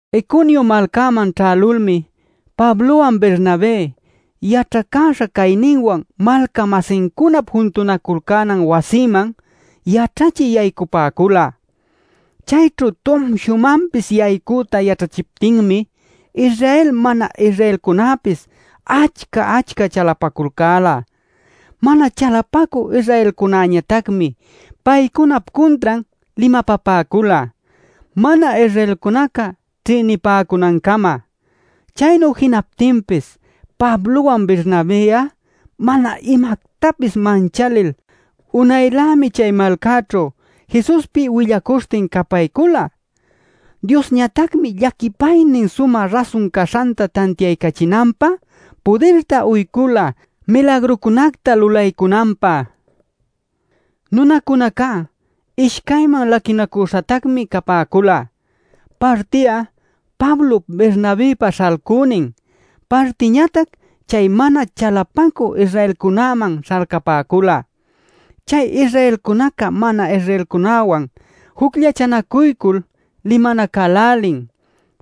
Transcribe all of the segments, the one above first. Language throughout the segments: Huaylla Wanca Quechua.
Iconio malcäman ćhälulmi Pablowan Bernabé yaćhacäśha cayninwan malca-masincunap juntunaculcänan wasiman yaćhachï yaycapäcula. Chayćhu tumshumanpis yaycüta yaćhachiptinmi Israel mana-Israelcunäpis achca-achca chalapaculcäla. Mana chalapacü Israelcunäñatacmi paycunap cuntran limapapäcula mana-Israelcunaca ćhïnipäcunancama. Chaynu jinaptinpis Pablowan Bernabë'a mana imactapis manchalil unaylämi chay malcäćhu Jesuspi willacuśhtin capaycula. Diosñatacmi llaquipaynin sumä rasun caśhanta tantiaycachinanpä pudirta uycula milagrucunacta lulaycunanpä. Nunacunacá ishcayman laquinacüśhatacmi capäcula: parti'a Pablop Bernabëpa śhalcünin, partiñatac chay mana chalapacü Israelcunäman śhalcapäcula. Chay Israelcunaca mana-Israelcunäwan jucllachanacuycul limanacälälin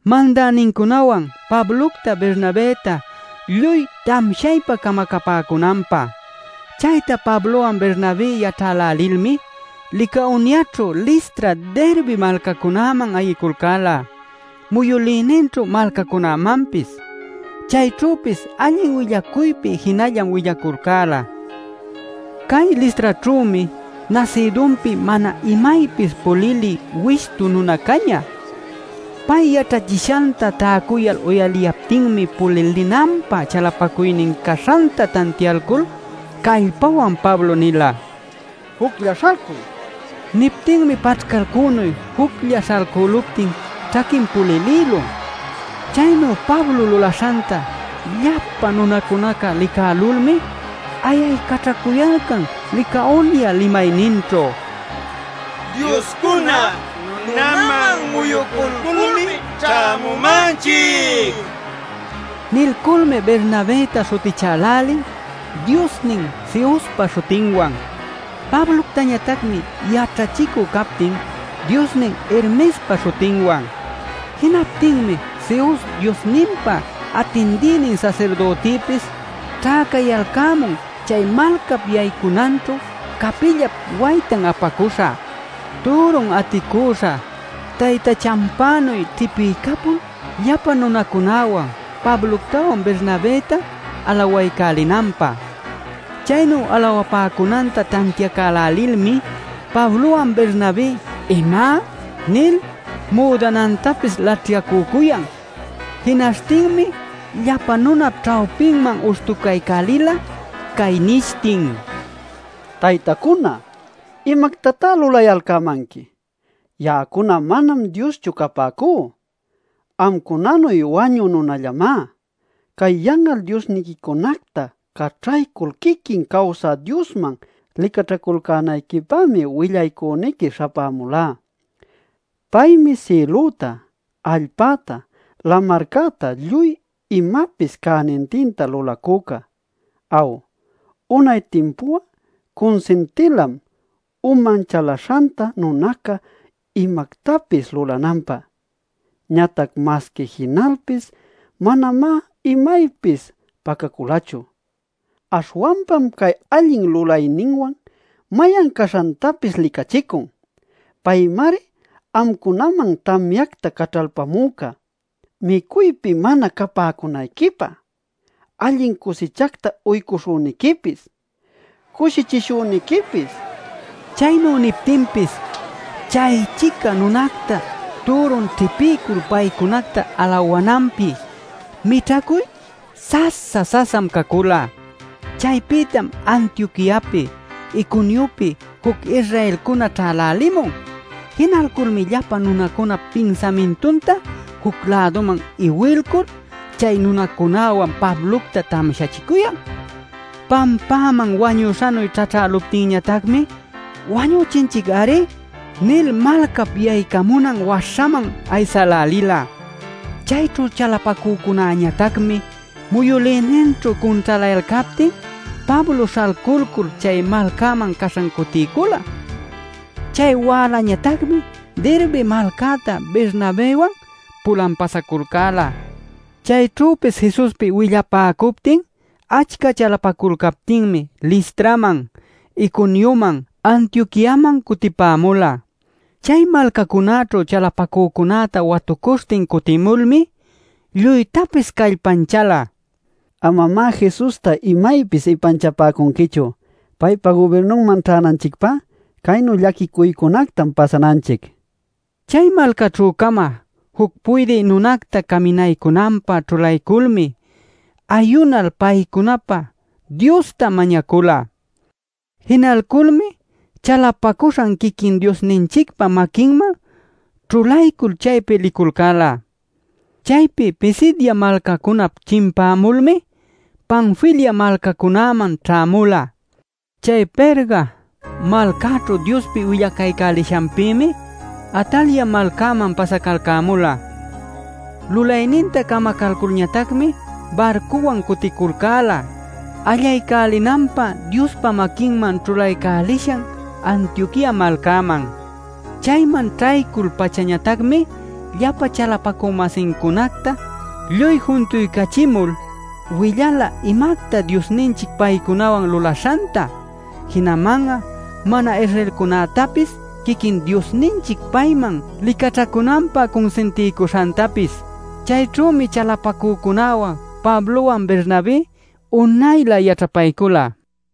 mandänincunawan Pablocta Bernabëta lluy tamshaypa camacapäcunanpä. Chayta Pablowan Bernabé yaćhälälilmi Licaoniaćhu Listra, Derbe malcacunäman ayiculcäla muyülïninćhu malcacunämanpis. Chayćhüpis allin willacuypi jinallam willaculcäla. Cay Listraćhümi nasïdunpi mana imaypis pulilï wishtu nuna cañä. Pay yaćhachishanta täcuyal uyaliyaptinmi pulilinanpä chalapacuynin caśhanta tantiaycul callpawan Pablo nila: “¡Juclla śhalcuy!” nil. Niptinmi paćhcalcünuy juclla śhalcüluptin ćhaquin pulilïlun. Chaynu Pablo lulaśhanta llapa nunacunaca licälulmi ayaycaćhacuyalcan Licaonia limayninćhu: “¡Dioscuna nunaman muyuculculmi ćhämumanchic!” nil. Nilculmi Bernabëta śhutichälälin diosnin Zeuspa śhutinwan, Pabloctañatacmi yaćhachicü captin diosnin Hermespa śhutinwan. Jinaptinmi Zeus diosninpa atindïnin sasirdütipis ćhäcayalcämun chay malcap yaycunanćhu capillap waytan apacüśha, türun aticüśha taytachanpänuy ćhipiycapul llapa nunacunäwan Pabloctawan Bernabëta alawaycälinanpä. Chaynu alawapäcunanta tantiacälälilmi Pablowan Bernabé “¡¿Ima?!” nil müdanantapis laćhyacücuyan. Jinaśhtinmi llapa nunap ćhawpinman uśhtucaycälila, cay nishtin: “Taytacuna ¡¿imactatá lulayalcämanqui?! Ya'acuna manam dioschu capäcú; amcunanuy wañü nunallamá. Cay yan'al diosniquicunacta caćhaycul quiquin cawsä Diosman licaćhaculcänayquipämi willaycüniqui śhapämulá. Paymi sïlüta, allpäta, lamarcäta lluy imapis cänintinta lulacüca. Aw, unay timpu'a cunsintilam uman chalaśhanta nunaca imactapis lulananpä. Ñatac masqui jinalpis manamá imaypis pacaculachu. Aśhwanpam cay allin lulayninwan mayan caśhantapis licachicun. Paymari amcunaman tamyacta caćhalpamüca, micuypi mana capäcunayquipä, allin cusichacta uycuśhüniquipis, cushichishüniquipis” nila. Chaynu niptinpis chay-chica nunacta türun ćhipiycul paycunacta alawananpi mićhacuy sasa-sasam cacula. Chaypïtam Antioquiapi, Iconiopi juc Israelcuna ćhälälimun. Jinalculmi llapa nunap pinsamintunta juc-läduman iwilcul, chay nunacunäwan Pablocta tamshachicuyan. Pampäman wañüśhanuy ćhaćhäluptinñatacmi “Wañüchinchic-ari” nil malcap yaycamunan waśhaman aysälälila. Chayćhu chalapacücunäñatacmi muyülïninćhu cunćhalayalcaptin Pablo śhalculcul chay malcäman caśhan cutiycula. Chay wälañatacmi Derbe malcäta Bernabëwan pulan pasaculcäla. Chayćhüpis Jesuspi willapäcuptin achca chalapaculcaptinmi Listraman, Iconioman, Antioquiaman cutipämula. Chay malcacunäćhu chalapacücunäta watucuśhtin cutimulmi lluytapis callpanchäla: “Amamá Jesusta imaypis ipanchapäcunquichu. Paypa gubirnunman ćhänanchicpá caynu llaquicuycunactam pasananchic” nil. Chay malcaćhü-cama juc puydï nunacta caminaycunanpä ćhulayculmi ayunal paycunapä Diosta mañacula. Jinalculmi chalapacuśhan quiquin Diosninchicpa maquinman ćhulaycul chaypi liculcäla. Chaypi Pisidia malcacunap chimpämulmi Panfilia malcacunäman ćhämula. Chay Perga malcäćhu Diospi willacaycälishanpïmi Atalia malcäman pasacalcämula. Lulayninta camacalculñatacmi barcuwan cuticulcäla allaycälinanpä Diospa maquinman ćhulaycälishan Antioquia malcaman. Chayman ćhaycul-pachañatacmi llapa chalapacü-masincunacta lluy juntuycachimul willala imacta Diosninchic paycunawan lulaśhanta, jinaman'a mana-Israelcunactapis quiquin Diosninchic payman licaćhacunanpä cunsintiycuśhantapis. Chayćhümi chalapacücunäwan Pablowan Bernabé unaylä yaćhapaycula.